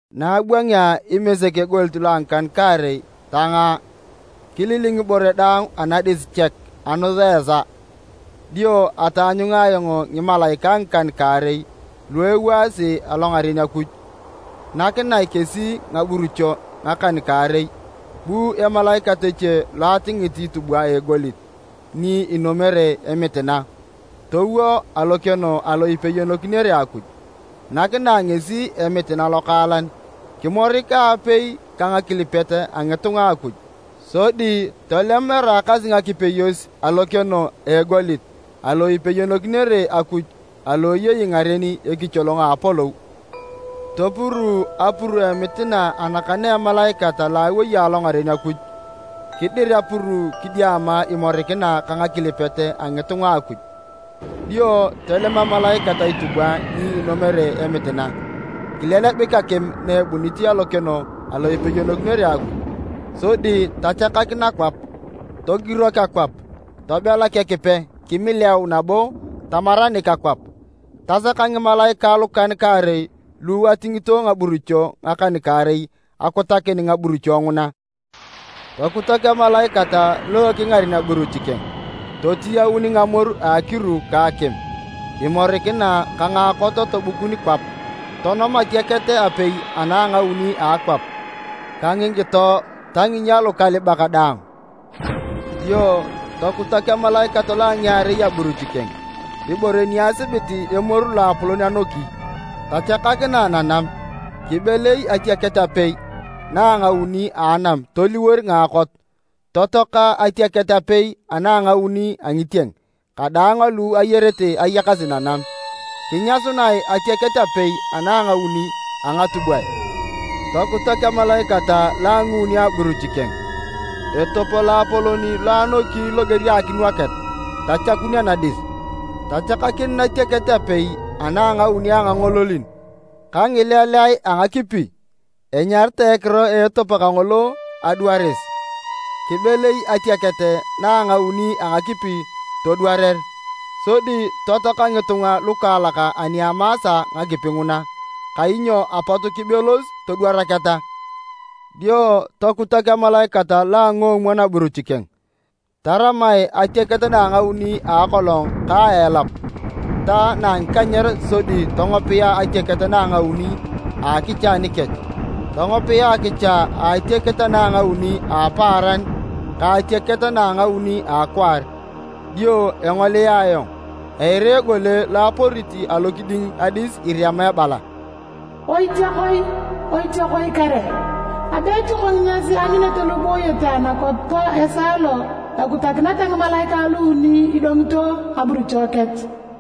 Na abwangea Imesek egoliet lo a ngikan-kaarei tangaa, kililing ibore daang anadis chek a anus a esaa. Dio ataanyunga ayong ngimalaikae ngikan-kaarei lu ewaasi alongaren Akuj, nakinae kesi ngaburucho ngakan-kaarei. Bu emalaikat eche lo atingit itubwa a egolit ni inomere emitina, towo alokeno alo ipeyonokinere Akuj. Nakinae ngesi emitina lokaalan kimorik aapei ka ngakilipet a ngitunga a Akuj, sodi tolem eraakasi ngakipeyos alokeno a egolit alo ipeyonokinere Akuj alo eyei ngaren ekicholong a apolou. Topuruu apuru a emitina anakan a emalaikat alo awei alongaren Akuj, kidir apuru kidiama imorikina ka ngakilipet a ngitunga a Akuj. Dio tolem emalaikat itubwa ni inomere emitina, kilelebik akim na ebunit alokeno alo ipeyonokinere Akuj, sodi tachakak nakwap. Togirok akwap, tobelak Ekipe, kimileau nabo tamaranik akwap. Tasaka ngimalaikae lukan-kaarei lu atingito ngaburucho ngakan-kaarei akutakin ngaburucho nguna. Tokutak emalaikat lo ekingaren aburuch keng. Totiyaun ngamoru a akiru ka akim, imorikina ka ngaakot tobukun kwap. Tonom atiaket apei ana a ngauni a akwap ka ngikito ta nginyia lukalibak daang. Dio tokutak emalaikat lo a ngiarei aburuch keng. Ibore ni asibit emoru loapolon anoki, tachakakinae nanam. Kibelei atiaket apei ana a ngauni a anam toliwor ngaakot, totoaka atiaket apei ana a ngauni a ngitieng kadaang alu ayarete ayakasi nanam, kinyasunae atiaket apei ana a ngauni a ngatubwae. Tokutak emalaikat lo a nguuni aburuch keng. Etop loapolon lo anoki loger a akinwaket, tachakun anadis, tachakakin natiaket apei ana a ngauni angangololin ka ngileleae a ngakipi. (Enyaritae ekiro a etop kangolo “Adwaris.”) Kibelei atiaket na a ngauni a ngakipi todwarer, sodi totoaka ngitunga lukaalak ani amaasa ngakipi nguna, kainyo apot kibelos todwaraketa. Dio tokutak emalaikat lo a nguomwon aburuch keng. Taramae atiaket na a ngauni a akolong ka na a elap ta na a ngikanyer sodi tongopia atiaket na a ngauni a akicha anikech. Tongopia akicha a atiaket ana a ngauni a apaaran ka atiaket na a ngauni a akwaar. Dio engolia ayong, eira egole lo aporit alokiding adis irema ebala, “Oitiakoi kare! Abe etioko nginyas eanyunete lu ibooyete anakwap esaa lo ekutakineta ngimalaikae luuni idongito ngaburucho kech!”